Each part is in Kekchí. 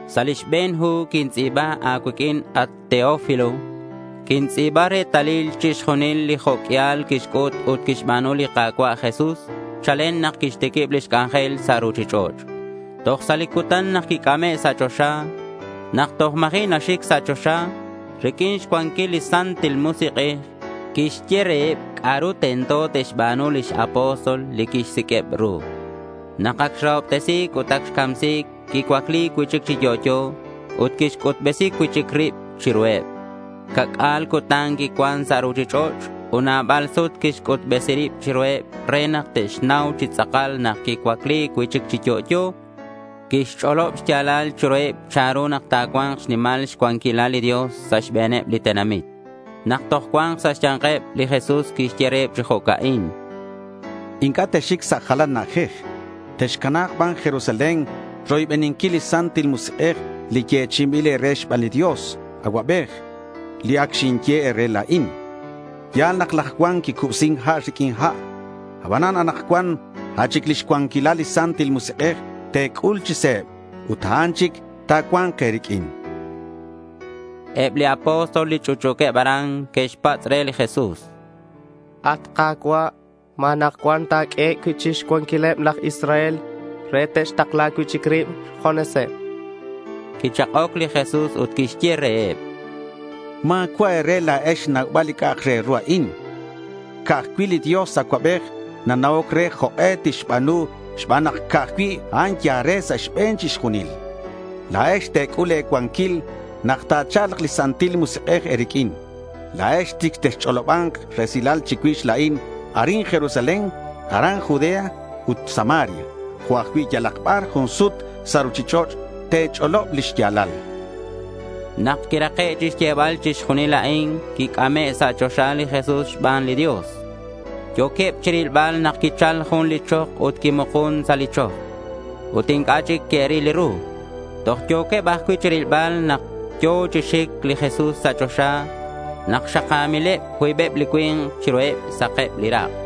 Sa' li xbe̱n hu quintz'i̱ba a̱cuiq'uin, at Teófilo, quintz'i̱ba retalil chixjunil li jo' q'uial quixc'ut ut quixba̱nu li Ka̱cua' Jesús chalen nak quixtiquib lix c'anjel sa' ruchich'och' toj sa' li cutan nak quic'ame' sa' choxa. Nak toj ma̱ji' naxic sa' choxa, riq'uin xcuanquil li Santil Musik'ej, quixye reheb c'a'ru tento te'xba̱nu lix apóstol li quixsiq'ueb ru. Nak ac xrahobtesi̱c ut ac xcamsi̱c, quicuacli cui'chic chi yo'yo ut quixc'utbesi cui'chic rib chiruheb. Ca'c'a̱l cutan quicuan sa' ruchich'och' ut nabal sut quixc'utbesi rib chiruheb re nak te'xnau chi tz'akal nak quicuacli cui'chic chi yo'yo. Quixch'olob xya̱lal chiruheb chanru nak ta̱cua̱nk xnimal xcuanquilal li Dios sa' xbe̱neb li tenamit. Nak toj cuan sa' xya̱nkeb li Jesús quixye reheb chi jo'ca'in: —Inc'a' texxic sa' jalan na'ajej. Texcana̱k ban Jerusalén roybeninquil li Santil Musik'ej li yechi'inbil e̱re xban li Dios Acuabej, li ac xinye e̱re la̱in. Ya̱l nak laj Juan quicubsin ha' riq'uin ha'. Abanan anakcuan a' chic lix cuanquilal li Santil Musik'ej te̱c'ul chi se̱b ut a'an chic ta̱cua̱nk e̱riq'uin, chan. Eb li apóstol li ch'utch'u̱queb aran que'xpatz' re li Jesús: —At Ka̱cua', ¿ma anakcuan ta̱q'ueheb cui'chic xcuanquileb laj Israel re te'xtakla cui'chic rib xjuneseb? chanqueb. Quichak'oc li Jesús ut quixye reheb: —Ma̱cua' e̱re la̱ex xnaubal li c'a'ak re ru a'in. Ca'aj cui' li Dios Acuabej nana'oc re jok'e tixba̱nu xban nak ca'aj cui' a'an yal re sa' xbe̱n chixjunil. La̱ex te̱c'ul le̱ cuanquil nak ta̱cha̱lk li Santil Musik'ej e̱riq'uin. La̱ex chic texch'oloba̱nk resilal chicuix la̱in arin Jerusalén, aran Judea ut Samaria. Jo' ajcui' yalak bar jun sut sa' ruchich'och' te̱ch'olob li xya̱lal, chan. Nak quirake' xyebal chixjunil a'in quic'ame' sa' choxa li Jesús xban li Dios. Yo̱queb chirilbal nak quichal jun li chok ut quimukun sa' li chok. Ut inc'a' chic que'ril ru. Toj yo̱queb ajcui' chirilbal nak yo̱ chi xic li Jesús sa' choxa nak xaka̱mileb cuibeb li cui̱nk chiruheb. Sakeb li rak'.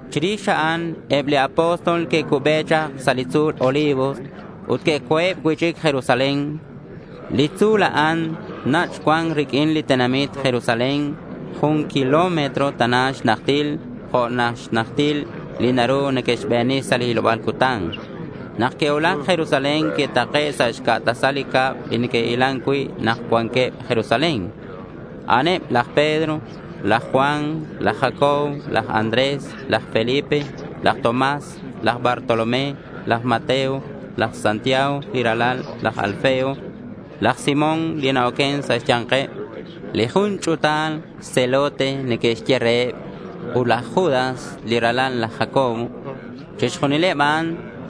Chirix a'an eb li apóstol que'cube chak sa' li tzu̱l Olivos ut que'co̱eb cui'chic Jerusalén. Li tzu̱l a'an nach' cuan riq'uin li tenamit Jerusalén, jun kilómetro tana xnajtil, jo' xnajtil li naru neque'xbeni sa' li hiloba̱l cutan. Nak que'cuulac Jerusalén que'take' sa' xca' tasal li cab li neque'hilan cui' nak cuanqueb Jerusalén. A'aneb laj Pedro, laj Juan, laj Jacobo, laj Andrés, laj Felipe, laj Tomás, laj Bartolomé, laj Mateo, laj Jacobo li ralal laj Alfeo, laj Simón li na-oquen sa' xya̱nkeb li jun ch'u̱tal Celote neque'xye reheb, ut laj Judas li ralal laj Jacobo. Chixjunileb a'an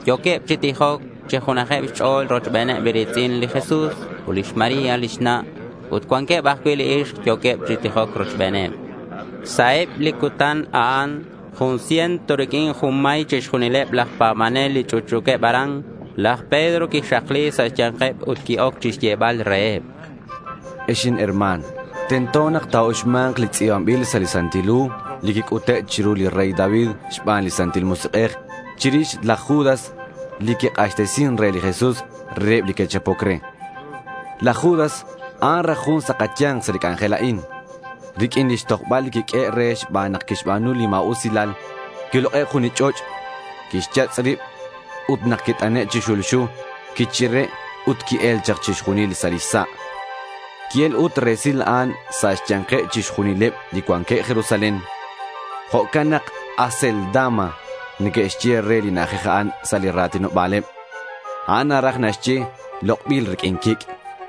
yo̱queb chi tijoc chi junajeb xch'o̱l rochbeneb li ri̱tz'in li Jesús ut lix María lix na'. Ut cuanqueb ajcui' ixk yo̱queb chi tijoc rochbeneb. Sa' eb li cutan a'an jun ciento riq'uin junmay chixjunileb laj pa̱banel li ch'utch'u̱queb aran. Laj Pedro quixakli sa' xya̱nkeb ut qui-oc chixyebal reheb: —Ex inherma̱n, tento nak ta̱uxma̱nk li tz'i̱banbil sa' li Santil Hu li quic'ute' chiru li rey David xban li Santil Musik'ej chirix laj Judas li quik'axtesin re li Jesús reheb li que'chapoc re. Laj Judas, a'an raj jun sa' kaya̱nk sa' li c'anjel a'in. Riq'uin lix tojbal li quiq'uehe' re xban nak quixba̱nu li ma̱usilal, quilok'e' jun li ch'och'. Quixyatz' rib ut nak quit'ane' chi xulxu, quichire' ut qui-el chak chixjunil sa' lix sa'. Qui-el ut resil a'an sa' xya̱nkeb chixjunileb li cuanqueb Jerusalén. Jo'can nak Acéldama neque'xye re li na'ajej a'an sa' li ra̱tinoba̱leb. A'an naraj naxye “Lok'bil riq'uin quic'.”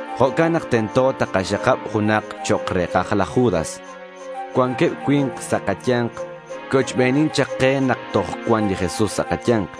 Jo'can nak tento takaxakab junak chok' re̱kaj laj Judas. Cuanqueb cui̱nk sa' kaya̱nk que'ochbenin chak ke nak toj cuan li Jesús sa' kaya̱nk,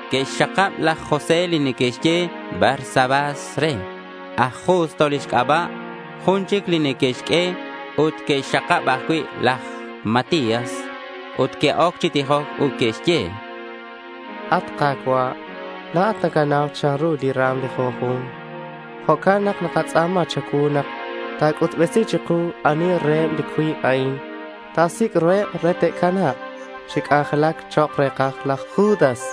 Que'xxakab laj José li neque'xye Barsabás re. Aj Justo lix c'aba' jun chic neque'xq'ue. Ut que'xxakab ajcui' laj Matías. Ut que'oc chi tijoc ut que'xye: —At Ka̱cua', la̱at nacanau chanru li ra̱m li junju̱nk. Jo'can nak nakatz'a̱ma cha̱cuu nak ta̱c'utbesi chiku ani reheb li cuib a'in ta̱sic' ru re ta̱cana̱k chi c'anjelac chok' re̱kaj laj Judas.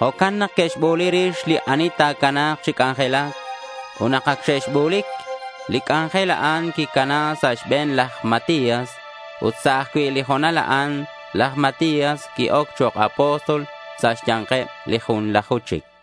Jo'can nak que'xbu̱li rix li ani ta̱cana̱k chi c'anjelac. Ut nak ac xe'bu̱lic, li c'anjel a'an quicana sa' xbe̱n laj Matías. Ut sa' ajcui' li ho̱nal a'an laj Matías qui-oc chok' apóstol sa' xya̱nkeb li junlaju chic.